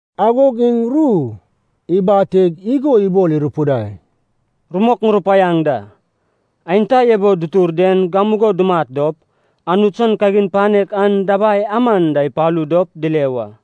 Agog iŋ ru ibateg igo ibol irupidai, “Rumok ŋurupaiaŋ da, aenta ebo dutur den gamugo dumat dop, Anut san kagin panek an dabai aman da ipalu dop dile wa.”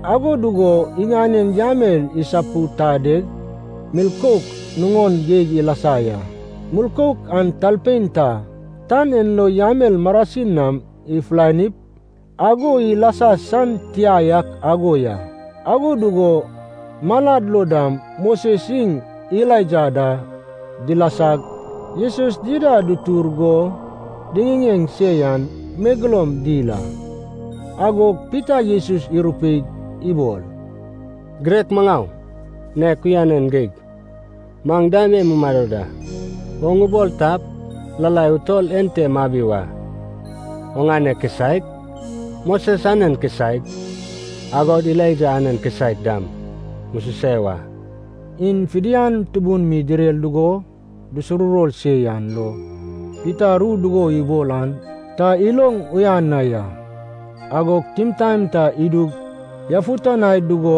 Ago dugo iŋanen yamel isapudadeg milkouk nuŋon geig ilasa ya. Milkouk an talpein ta tan en lo yamel marasin nam ifulanip ago ilasa san tia yak ago ya. Ago dugo malad lo dam Moses iŋ Elaija da dilasag, Jesus dida dutur go diŋiŋeŋ se yan megeloum dil a. Agog Pita Jesus irupeig ibol, “Girek maŋau, nek uyanan geig maŋ dam e mumado da! Oŋ ubol tap, lalai utol ente mabi wa, oŋane kisaek, Moses anen kisaek, agod Elaija anen kisaek dam mususe wa.” (Iŋ fidian tubun mi direr dugo dusuruwor se yan lo, Pita ru dugo ibol an ta iloŋ uyan na ya.) Agog timtaen ta idug yafutanai dugo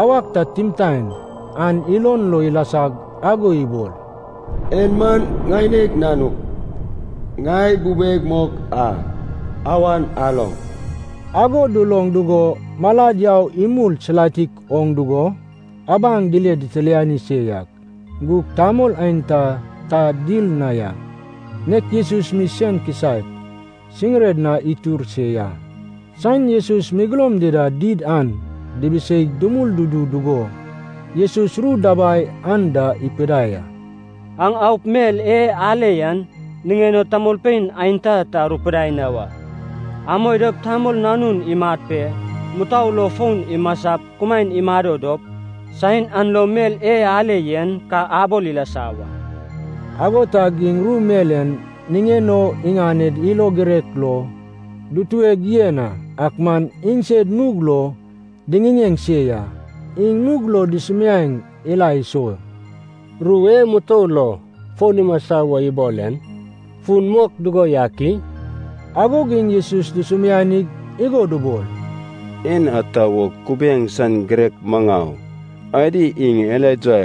awak ta timtaen an ilon lo ilasag ago ibol, “En man ŋaineg Nanug, ŋai bubeg mok a. Awan aloŋ!” Ago duloŋ dugo malad yau imul silatik oŋ dugo abaŋ dile itililani se yak gug tamol aenta ta dil na ya, nek Jesus mi sen kisaek siŋired na itur se ya. Saen Jesus megeloum dida did an dibiseig dumul dudu dugo, Jesus ru dabai anda ipidinai a. “Aŋ aup mel e ale yan niŋen o tamolpein aenta ta arupidai na wa. Amoi dop Tamol Nanun imat pe mutou lo fon imasap kumaen imado dop, saen an lo mel e ale yen ka abol ilasa wa.” Ago tag iŋ ru mel en niŋen o iŋanen ilo girek lo dutueg yen a, ak man iŋsed nug lo diŋiŋeŋ se ya. Iŋ nug lo dusumiaeŋ ila iso, “Ru e mutou lo fon imasa wo ibol en fun mok dugo yak i?” Agog iŋ Jesus dusumianig igo dubol, “En ata wo kubiaeŋ san girek maŋau adi iŋ Elaija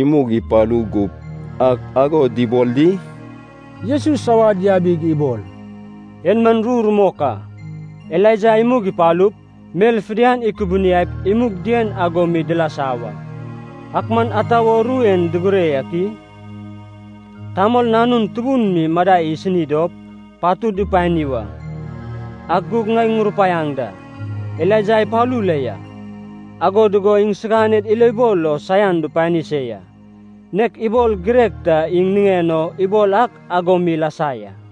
imug ipalu gup ak ago dubol di?” Jesus awad yabig ibol, “En man ru rumok a, Elaija imug ipalup, mel fidian ikubuniaip imug dien ago mi dilasa wa. Ak man ata wo ru en digire yak i? Tamol Nanun tubun mi madai isini dop patud dupani wa. Ak gug ŋai ŋurupaiaŋ da, Elaija ipalu la ya. Ago dugo iŋsiganed ilobol lo saian dupani se ya, nek ibol girek ta iŋ niŋen o ibol ak ago mi ilasa ya.”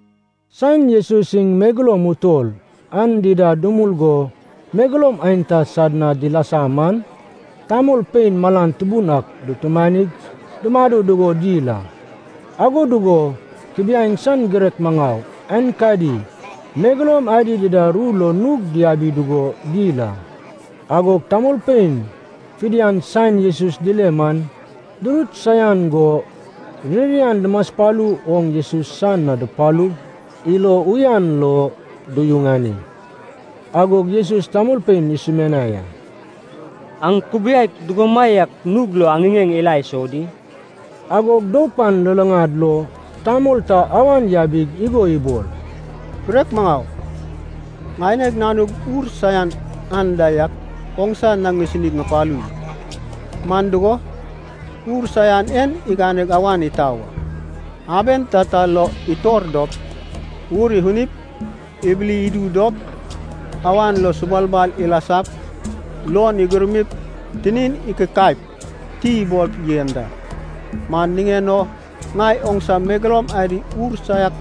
Saen Jesus iŋ megeloum utol an dida dumul go megeloum aenta sad na dilasa man, tamolpein malan tubun ak dutumanig dumado dugo dil a. Ago dugo kubiaeŋ san girek maŋau aenkadi megeloum adi dida ru lo nug diabi dugo dil a. Agog tamolpein fidian saen Jesus dile man durut saian go ririan dumaspalu oŋ Jesus san na dupalug ilo uyan lo duyuŋani. Agog Jesus tamolpein isumianai a, “Aŋ kubiaek dugomaiak nug lo aŋiŋeŋ ila iso di?” Agog doup an luluŋad lo tamol ta awan yabig igo ibol, “Girek maŋau, ŋaineg nanug ur saiak anda yak oŋsa na ŋisini ŋupalu ya. Man dugo, ur saian en iganeg awan itau a. Aben tata lo itor dop, ur ifunip ibili idu dop, awan lo subalbal ilasap, luon igurmip tinin ikikaip ti ibol yen da. Man niŋen o ŋai oŋsa megeloum adi ur saiak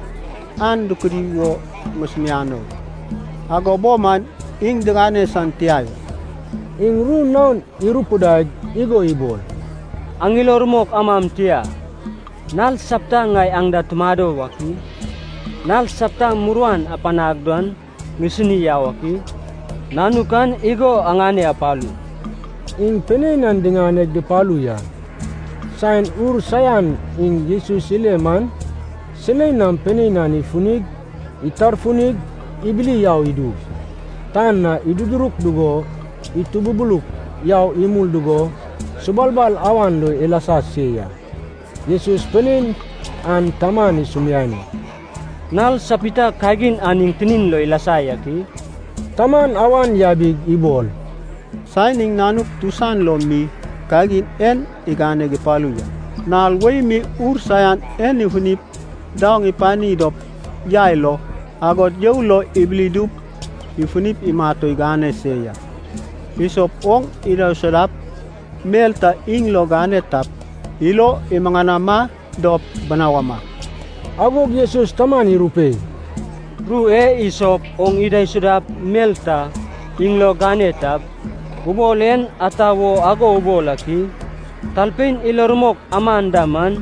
an dukudi wo ŋusumianai, ago bo man iŋ digane san tia ya.” Iŋ ru naon irupidaig igo ibol, “Aŋ ilo rumok amam tia, nal sapta ŋai aŋ da tumado wak i? Nal sapta muruan apanag dan ŋisinip yau ak i? Nanuk an igo aŋane apalu.” Iŋ pinein an diŋane dupalu ya. Saen ur saian iŋ Jesus ile man, silei nam pinein an ifunig itarfunig ibili yau idug, tan na idududuruk dugo itububuluk yau imul dugo subalbal awan lo ilasa se ya. Jesus pinein an taman isumiani, “Nal sapita kagin an iŋ tinin lo ilasa yak i?” Taman awan yabig ibol, “Saen iŋ nanuk tusan lo mi kagin en iganeg ipalu ya. Nal wei mi ur saiak en ifunig daoŋ ipani dop yai lo, agod you lo ibili idup ifuni imat o igane se ya. Isop oŋ idaisudap mel ta iŋ lo gane tap, ilo imuŋanama dop binawama.” Agog Jesus taman irupei, “Ru e ‘Isop oŋ idaisudap mel ta iŋ lo gane tap’ ubol en ata wo ago ubol ak i? Talpein ilo rumok aman da man,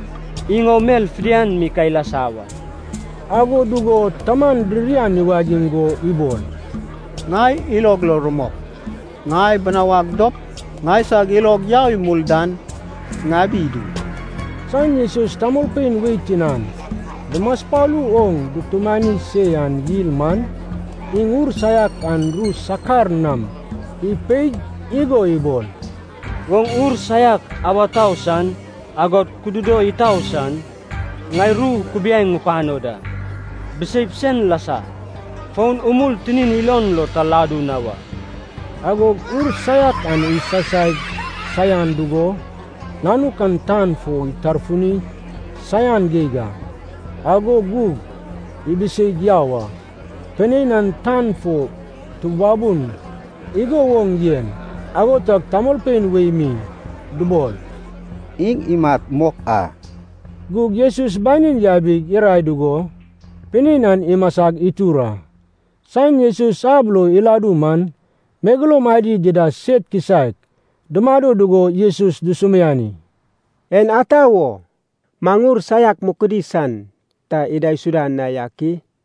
iŋ o mel fidian mi ka ilasa wa.” Ago dugo taman ririan iwagiŋ go ibol, “Ŋai ilog lo rumok. Ŋai binawag dop ŋaisag ilog yau imul dan ŋabi idu!” Saen Jesus tamolpein wei tinan dumaspalu oŋ dutumani se yan yil man, iŋ ur saiak an ru sakar nam ipeig igo ibol, “Oŋ ur saiak awa tau san agod kududo itau san, ŋai ru kubiaeŋ ŋupano da, biseip sen lasa, fon umul tinin ilon lo ta ladu na wa.” Agog ur saiak an isasai saian dugo nanuk an tan fo itarfuni saian geig a, ago gug ibiseig yau a. Pinein an tan fo tubabun igo woŋ yen, ago tag tamolpein wei mi dubol, “Iŋ imat mok a.” Gug Jesus banin yabig irae dugo, pinein an imasag itur a. Saen Jesus ab lo iladu man, megeloum adi dida sed kisaek dumado dugo Jesus dusumiani, “En ata wo maŋ ur saiak mukudi san ta idaisuda na yak i?”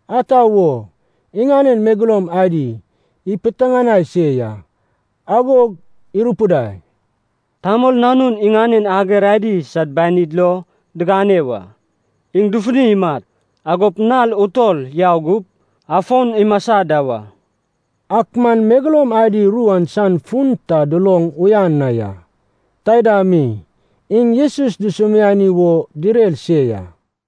Ata wo? Iŋanen megeloum adi ipiteŋanai se ya. Agog irupidai, “Tamol Nanun iŋanen ager adi sad banid lo digane wa. Iŋ dufuni imat, agop nal utol yau gup, afon imasa da wa.” Ak man megeloum adi ru an san fun ta duloŋ uyan na ya. Taida mi, iŋ Jesus dusumiani wo direr se ya.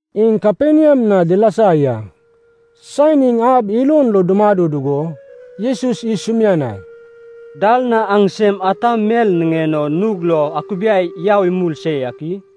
Iŋ Kaperniam na dilasa ya. Saen iŋ ab ilon lo dumado dugo, Jesus isumianai, “Dal na aŋsem ata mel niŋen o nug lo akubiai yau imul se yak i?”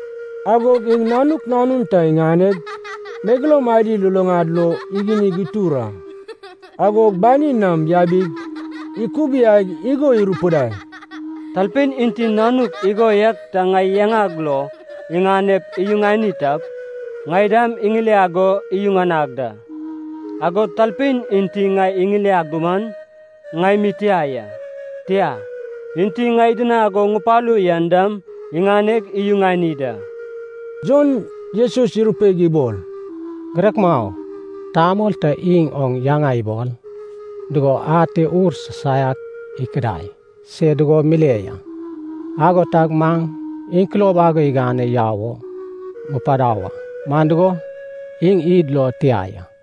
Agog iŋ nanuk nanun ta iŋaneg, megeloum adi luluŋad lo igunig itur a. Agog banin nam yabig ikubiaig igo irupidai, “Talpein enti nanuk igo yak ta ŋai yaŋag lo iŋanep iyuŋani tap, ŋai dam iŋiliag go iyuŋanag da. Agod talpein enti ŋai iŋiliag duman, ŋai mi tia ya, tia, Enti ŋai idinag go ŋupalu yan dam iŋaneg iyuŋani da.” Jon Jesus irupeig ibol, “Girek maŋau, tamol ta iŋ oŋ yaŋa ibol dugo ate ur sisaiak ikudai se dugo mile ya. Ago tag maŋ iŋ kulob ago igane yau o mupadau a, man dugo, iŋ id lo tia ya.”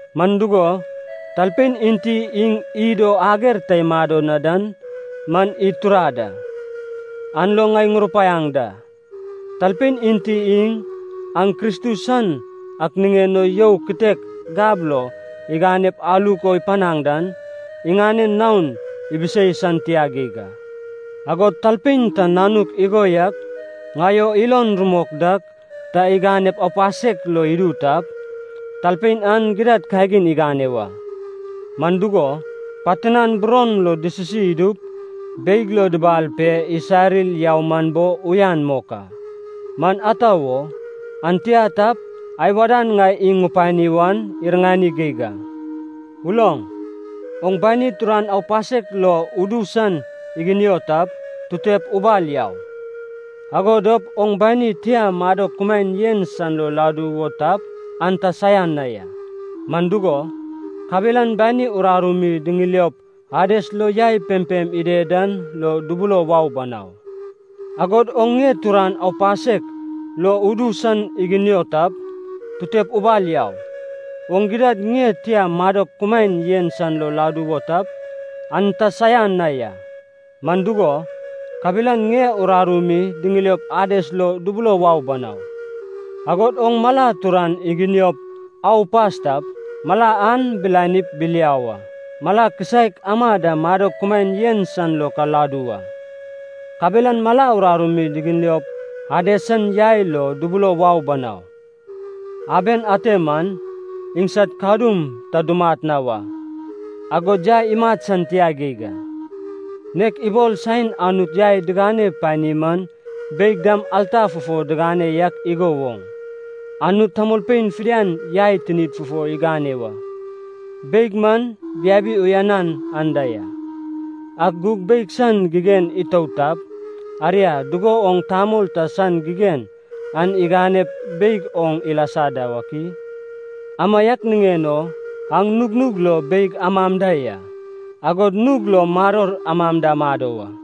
Man dugo, talpein enti iŋ id o ager ta imado na dan man id turad a. An lo ŋai ŋurupaiaŋ da, talpein enti iŋ, aŋ Kristus san ak niŋen o you kitek gab lo iganeg aluk o ipanaŋ dan, iŋanen naon ibisei san tia geig a.” “Agod talpein ta nanuk igo yak ŋai o ilon rumok dak ta iganep aupasek lo idu tap, talpein an gidad kagin igane wa. Man dugo, pat tinan buron lo disisi idup beig lo dibal pe isarir yau man bo uyan mok a. Man ata wo, an tia tap, ai wadan ŋai iŋ ŋupani wan iriŋani geig a. Uloŋ. Oŋ bani turan aupasek lo udu san iginio tap, tutep ubal yau! Ago dop oŋ bani tia madok kumaen yen san lo ladu wo tap, an ta saian na ya. Man dugo, kabelan bani uraru mi diŋiliop Ades lo yai pempem ided dan lo dubulo wau banau. Agod oŋ ŋie turan aupasek lo udu san iginio tap, tutep ubal yau! Oŋ gidad ŋie tia madok kumaen yen san lo ladu wo tap, an ta saian na ya. Man dugo, kabelan ŋie uraru mi diŋiliop Ades lo dubulo wau banau. Agod oŋ mala turan iginiop au upas tap, mala an bilanip biliau a. Mala kisaek ama da madok kumaen yen san lo ka ladu wa. Kabelan mala uraru mi diŋiliop Ades san yai lo dubulo wau banau. Aben ante man, ‘iŋsad kadum ta dumat na wa, agod yai imat san tia geig a.’ Nek ibol saen Anut yai digane pani man beig dam alta fufo digane yak igo woŋ, Anut tamolpein fidian yai tinid fufo igane wa. Beig man biabi uyanan anda ya. Ak gug beig san gigen itout tap, aria dugo woŋ tamol ta san gigen an iganep beig oŋ ilasa da wak i? Amaiak niŋen o aŋ nugnug lo beig amam da ya, agod nug lo maror amam da amado wa.”